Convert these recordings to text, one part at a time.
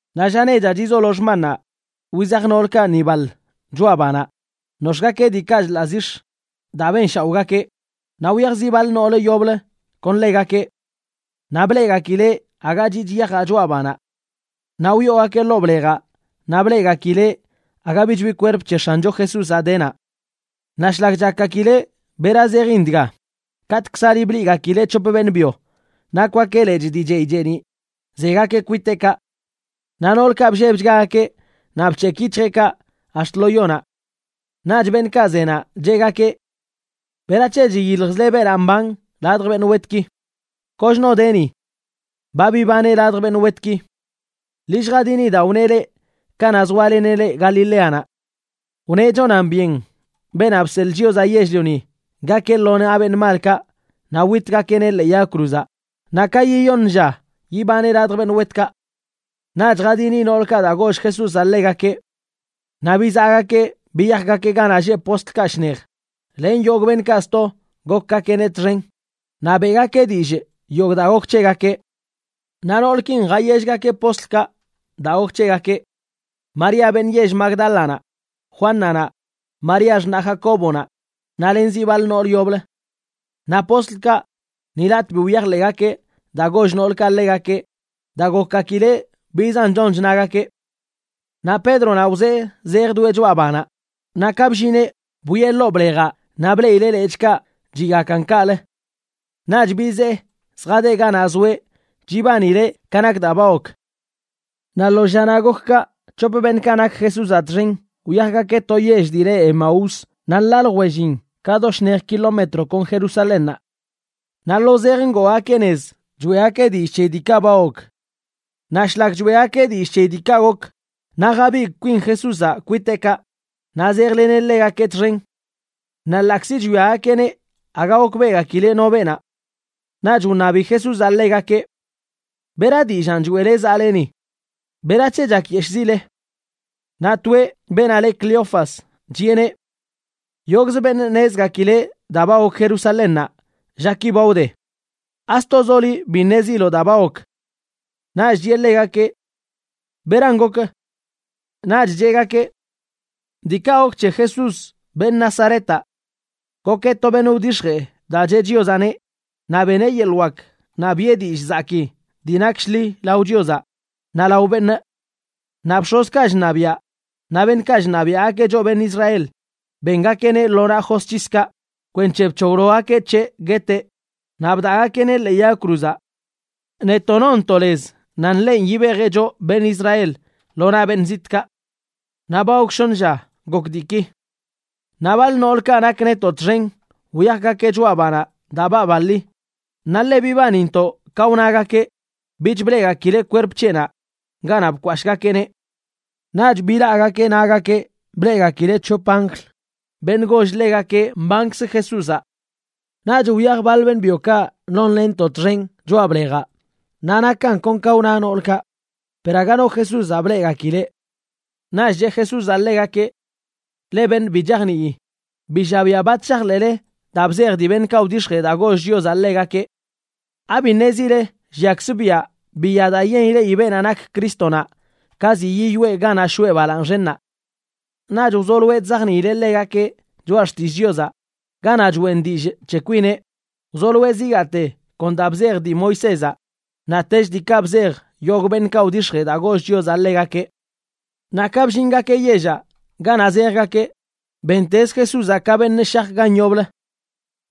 Naꞌ lla nechaꞌ chizolo xmannaꞌ, wizaj noolkaꞌ ni baḻ choꞌa banaꞌ, nox̱ꞌgakeꞌ diikaꞌ chḻaꞌ zix̱ daa benshaoꞌgakeꞌ, naꞌ wyaj zi baḻ noolə yoblə kon ḻegakeꞌ. Naꞌ bleꞌgakileꞌ aga chiꞌch yajaꞌ choꞌa banaꞌ. Naꞌ wyoogakeꞌ ḻoo blejaꞌ, naꞌ bleꞌgakileꞌ aga bich bi kwerp c̱he X̱ancho Jesúzaꞌ de naꞌ. Naꞌ shlak chakgakileꞌ bera zejin dga, katꞌkzali bleꞌgakileꞌ c̱hop beṉꞌ byo, nakwgakeꞌ lechꞌ dii chey cheeniꞌ, zegakeꞌ kwiteꞌkaꞌ. Naꞌ noolkaꞌ bllebchgagakeꞌ naꞌ bc̱hekꞌ yic̱hjeꞌkaꞌ ax̱t lo yonaꞌ. Naꞌch beṉꞌkaꞌ zenaꞌ cheꞌgakeꞌ: ―¿Berac̱he chiyiljzle beenaꞌ mban ladj beṉꞌ wetki? Kochno de ni. Ba bibaneꞌ ladj beṉꞌ wetki. Ḻi lljadini daa wneꞌ leꞌ kanaꞌ zoaleneꞌ leꞌ Galileanaꞌ. Wneꞌ chonan byen Beenaꞌ Bseḻꞌ Chiozaꞌ Yell-lioni gakeꞌ lo naꞌ beṉꞌ malkaꞌ, naꞌ witgakeꞌneꞌ ḻee yag cruzaꞌ, naꞌ ka yiyoṉ lla yibaneꞌ ladj beṉꞌ wetkaꞌ. Naꞌch jadini noolkaꞌ daa goll Jesúzaꞌ ḻegakeꞌ. Naꞌ bizaꞌgakeꞌ biyajgakeꞌ ganaꞌ lleꞌ postlkaꞌ shnej len yogꞌ beṉꞌkaꞌ sto gokgakeꞌneꞌ txen, naꞌ beꞌgakeꞌ dillꞌ yogꞌ daa gok c̱hegakeꞌ. Naꞌ noolkin jayellgakeꞌ postlkaꞌ daa gok c̱hegakeꞌ: María beṉꞌ yell Magdálanaꞌ, Juánanaꞌ, María xṉaꞌ Jacóbonaꞌ, naꞌ len zi baḻ nool yoblə. Naꞌ postlkaꞌ ni latꞌ bi wyajḻeꞌgakeꞌ daa goll noolkaꞌ ḻegakeꞌ daa gokgakileꞌ bizan chon chnagakeꞌ. Naꞌ Pédronaꞌ wzee zejdoeꞌ choꞌa banaꞌ, naꞌ ka bllineꞌ, bwieꞌ ḻoo blejaꞌ naꞌ bleꞌileꞌ lechꞌkaꞌ chiꞌgakan kaꞌlə. Naꞌch bizee zjadeꞌ ganaꞌ zoeꞌ chibanileꞌ ka nak daa ba gok. Naꞌ lo llanaꞌ gok kaꞌ, c̱hop beṉꞌkaꞌ nak Jesúzaꞌ txen wyajgakeꞌ to yell dii le Emaús, naꞌ nḻaa ljwellin ka do shnej kilometro kon Jerusalénnaꞌ. Naꞌ lo zej ngoogakeꞌ nez choeꞌgakeꞌ dillꞌ c̱heyi diikaꞌ ba gok. Naꞌ shlak choeꞌgakeꞌ dillꞌ c̱heyi diikaꞌ gok, naꞌ jabigꞌ kwin Jesúzaꞌ kwiteꞌkaꞌ naꞌ zejleneꞌ ḻegakeꞌ txen. Naꞌ ḻaꞌkzi chwiagakeꞌneꞌ, aga gokbeꞌgakileꞌ no beenaꞌ. Naꞌch wṉabi Jesúzaꞌ ḻegakeꞌ: ―¿Bera dillaan choeꞌle zaꞌle ni? ¿Berac̱he chakyeshꞌzile? Naꞌ toeꞌ, beenaꞌ le Cleofas, chiꞌeneꞌ: ―Yogꞌzə beṉꞌ ṉezgakileꞌ daa ba gok Jerusalénnaꞌ llaki ba wde. ¿Astozoꞌ liꞌ bi ṉeziloꞌ daa ba gok? Naꞌch chiꞌe ḻegakeꞌ: ―¿Beran gok? Naꞌch cheꞌgakeꞌ: ―Diikaꞌ gok c̱he Jesús, beṉꞌ Nazaretaꞌ. Gokeꞌ to beṉꞌ wdix̱jee daa cheꞌ Chiozaꞌneꞌ, naꞌ beneꞌ yeḻꞌ wak naꞌ biꞌe dillꞌ zakii dii nak shḻi lao Chiozaꞌ naꞌ lao beṉꞌ. Naꞌ bx̱ozkaꞌ chṉabiaꞌ naꞌ beṉꞌkaꞌ chṉabiaꞌgakeꞌ choꞌ beṉꞌ Israel bengakeꞌneꞌ lo naꞌ josc̱hiskaꞌ kwenc̱he bc̱hoglogakeꞌ c̱heꞌ gueteꞌ, naꞌ bdaꞌgakeꞌneꞌ ḻee yag cruzaꞌ. Netoꞌ nonntoꞌ lez nan ḻenꞌ yibejeꞌ choꞌ beṉꞌ Israel lo naꞌ beṉꞌ zitꞌkaꞌ. Naꞌ ba gok shoṉ lla gok diiki. Naꞌ baḻ noolkaꞌ nak netoꞌ txen wyajgakeꞌ choꞌa banaꞌ daa baabaḻi, naꞌ ḻe bibanintoꞌ ka wnagakeꞌ bich bleꞌgakileꞌ kwerp c̱heꞌnaꞌ ganaꞌ bkwashꞌgakeꞌneꞌ. Naꞌch bilaꞌgakeꞌ nagakeꞌ bleꞌgakileꞌ c̱hop anjl, beṉꞌ goll ḻegakeꞌ mbankzə Jesúzaꞌ. Naꞌch wyaj baḻ beṉꞌ byokaꞌ nonlenntoꞌ txen choꞌa blejaꞌ, naꞌ nakan kon ka wna noolkaꞌ, per aga no Jesúzaꞌ bleꞌgakileꞌ. Naꞌch cheꞌ Jesúzaꞌ ḻegakeꞌ: ―¡Leꞌ beṉꞌ bi chajnii! ¡Bi llabiaꞌ bat shajḻeꞌle daa bzej dii beṉꞌkaꞌ wdix̱jee daa goll Chiozaꞌ ḻegakeꞌ! ¿Abi ṉezile lliakzə biaꞌ biya daa yen ileꞌi beenaꞌ nak Crístonaꞌ ka ziꞌ yiyoꞌe ganaꞌ shoꞌe balaaṉ xennaꞌ? Naꞌch wzoloeꞌ chzajniileꞌ ḻegakeꞌ Choꞌa Xtillꞌ Chiozaꞌ ganaꞌ choꞌen dillꞌ c̱he kwineꞌ, wzoloeꞌ zigaate kon daa bzej dii Moisézaꞌ, naꞌtech diikaꞌ bzej yogꞌ beṉꞌkaꞌ wdix̱jee daa goll Chiozaꞌ ḻegakeꞌ. Naꞌ ka bllingakeꞌ yellaꞌ ganaꞌ zejgakeꞌ, bentezə Jesúzaꞌ ka beṉꞌ shaj gan yoblə.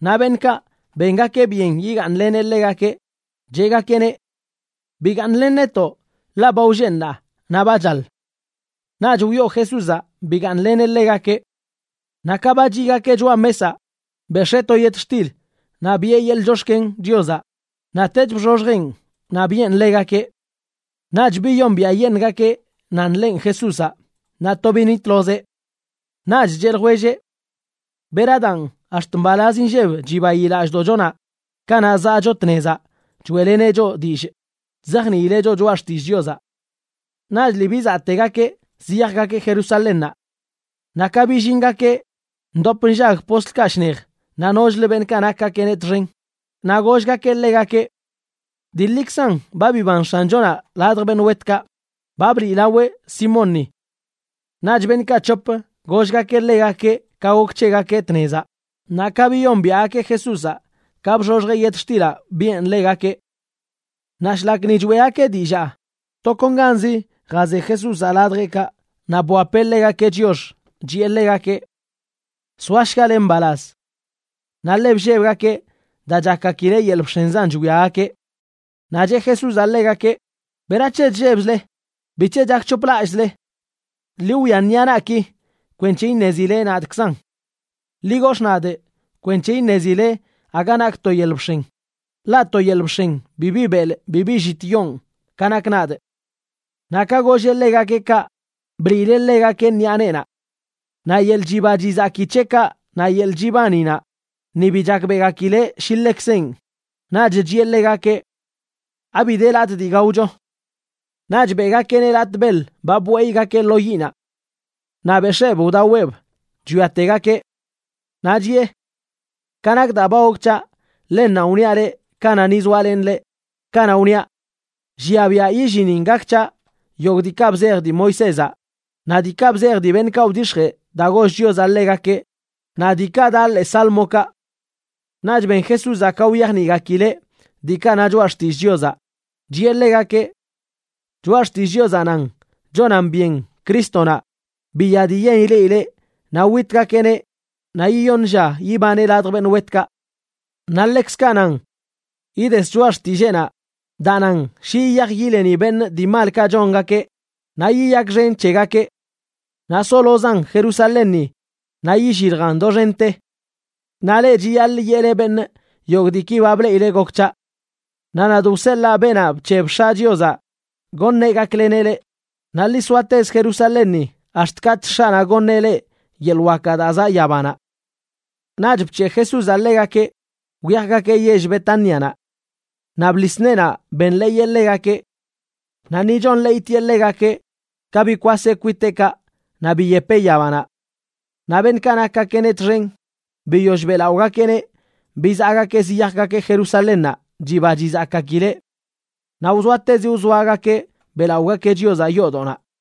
Naꞌ beṉꞌkaꞌ bengakeꞌ byen yigaaṉleneꞌ ḻegakeꞌ, cheꞌgakeꞌneꞌ: ―Bigaaṉlen netoꞌ, ḻaꞌ ba wlleꞌ ṉaa, naꞌ ba chaḻ. Naꞌch wyoo Jesúzaꞌ bigaaṉleneꞌ ḻegakeꞌ. Naꞌ ka ba chiꞌgakeꞌ choꞌa mesaꞌ, bex̱ee to yetxtil naꞌ biꞌe yeḻꞌ chox̱ken Chiozaꞌ, naꞌtech bxoxjeꞌn naꞌ biꞌen ḻegakeꞌ. Naꞌch biyombiaꞌyeṉꞌgakeꞌ nan ḻenꞌ Jesúzaꞌ, naꞌ to binitlozeꞌ. Naꞌch cheꞌ ljwelleꞌ: ―¡Bera daan, ax̱t mbalaz inlleb chibayi lallꞌdoꞌchonaꞌ kanaꞌ zaꞌcho tnezaꞌ choeꞌleneꞌ choꞌ dillꞌ chzajniileꞌ choꞌ Choꞌa Xtillꞌ Chiozaꞌ! Naꞌch lii bizaꞌtegakeꞌ ziyajgakeꞌ Jerusalénnaꞌ. Naꞌ ka billingakeꞌ, ndop nllag postlkaꞌ shnej naꞌ nochlə beṉꞌkaꞌ nakgakeꞌneꞌ txen, naꞌ gollgakeꞌ ḻegakeꞌ: ―Dii ḻikzan ba biban X̱anchonaꞌ ladj beṉꞌ wetkaꞌ. Ba bliꞌlaweꞌ Simónni. Naꞌch beṉꞌkaꞌ c̱hop gollgakeꞌ ḻegakeꞌ ka gok c̱hegakeꞌ tnezaꞌ, naꞌ ka biyombiaꞌgakeꞌ Jesúzaꞌ ka bxoxjeꞌ yetxtilaꞌ biꞌen ḻegakeꞌ. Naꞌ shlak ni choeꞌgakeꞌ dillaa, tokonganzi jaze Jesúzaꞌ ladjeꞌkaꞌ naꞌ bwapeꞌ ḻegakeꞌ chiox, chiꞌe ḻegakeꞌ: ―Soashgale mbalaz. Naꞌ ḻe bllebgakeꞌ daa chakgakileꞌ yel bx̱enzan chwiagakeꞌ. Naꞌ cheꞌ Jesúzaꞌ ḻegakeꞌ: ―¿Berac̱he chllebzle? ¿Bic̱he chak c̱hoplallꞌzle? Ḻi wwia ṉiꞌa naꞌki kwenc̱he iṉezile nadꞌkzan. Ḻi gox̱ꞌ nadꞌ kwenc̱he iṉezile aga nakꞌ to yel bx̱en, ḻaꞌ to yel bx̱en bibi belꞌ bibi llit yoon ka nakꞌ nadꞌ. Naꞌ ka golleꞌ ḻegakeꞌ kaꞌ, bliileꞌ ḻegakeꞌ ṉiꞌa neenaꞌ. Naꞌ yeḻꞌ chiba chizaki c̱heꞌkaꞌ naꞌ yeḻꞌ chibaninaꞌ, ni bi chakbeꞌgakileꞌ shi ḻekzenꞌ. Naꞌch chiꞌe ḻegakeꞌ: ―¿Abi de latꞌ dii gaocho? Naꞌch beꞌgakeꞌneꞌ latꞌ beḻ ba bweyꞌgakeꞌ lo yiꞌnaꞌ. Naꞌ bex̱eeb wdaweꞌb chwiategakeꞌ. Naꞌ chiꞌe: ―Ka nak daa ba gok c̱haꞌ, ḻennanꞌ wniaꞌ leꞌ kanaꞌ ni zoalenꞌ leꞌ, kanaꞌ wniaꞌ llia biaꞌ yillinin gak c̱haꞌ yogꞌ diikaꞌ bzej dii Moisézaꞌ, naꞌ diikaꞌ bzej dii beṉꞌkaꞌ wdix̱jee daa goll Chiozaꞌ ḻegakeꞌ naꞌ diikaꞌ daꞌ ḻee sálmokaꞌ. Naꞌch ben Jesúzaꞌ ka wyajniꞌgakileꞌ diikaꞌ na Choꞌa Xtillꞌ Chiozaꞌ, chiꞌe ḻegakeꞌ: ―Choꞌa Xtillꞌ Chiozaꞌ nan: chonan byen Crístonaꞌ, biya dii yen ileꞌileꞌ naꞌ witgakeꞌneꞌ naꞌ yiyoṉ lla yibaneꞌ ladj beṉꞌ wetkaꞌ. Naꞌ ḻekzkaꞌ nan: ides choꞌa xtilleenaꞌ daa nan shi yiyaj yileni beṉꞌ dii malkaꞌ chongakeꞌ naꞌ yiyakxen c̱hegakeꞌ. Naꞌ solozan Jerusalénni naꞌ illiljan doxente. Naꞌ leꞌ chiyaḻꞌ yeꞌle beṉꞌ yogꞌ diiki ba bleꞌile gok c̱haꞌ. Naꞌ nadꞌ wseḻaa beenaꞌ bc̱heb X̱aꞌ Chiozaꞌ goṉeꞌ gakleneꞌ leꞌ, naꞌ ḻi soatezə Jerusalénni ax̱t katꞌch X̱aꞌnaꞌ goṉeꞌ leꞌ yeḻꞌ wakaꞌ daa zaꞌ yabanaꞌ. Naꞌch bc̱heꞌ Jesúzaꞌ ḻegakeꞌ wyajgakeꞌ yell Betánianaꞌ. Naꞌ bḻis neenaꞌ benḻeeyeꞌ ḻegakeꞌ. Naꞌ ni chonḻeeytieꞌ ḻegakeꞌ, ka bikwaseꞌ kwiteꞌkaꞌ naꞌ biyepeꞌ yabanaꞌ. Naꞌ beṉꞌkaꞌ nakgakeꞌneꞌ txen, biyoll beꞌlaꞌogakeꞌneꞌ, bizaꞌgakeꞌ ziyajgakeꞌ Jerusalénnaꞌ chiba chizakgakileꞌ. Naꞌ wzoatezi wzoagakeꞌ beꞌlaꞌogakeꞌ Chiozaꞌ yoodoꞌnaꞌ.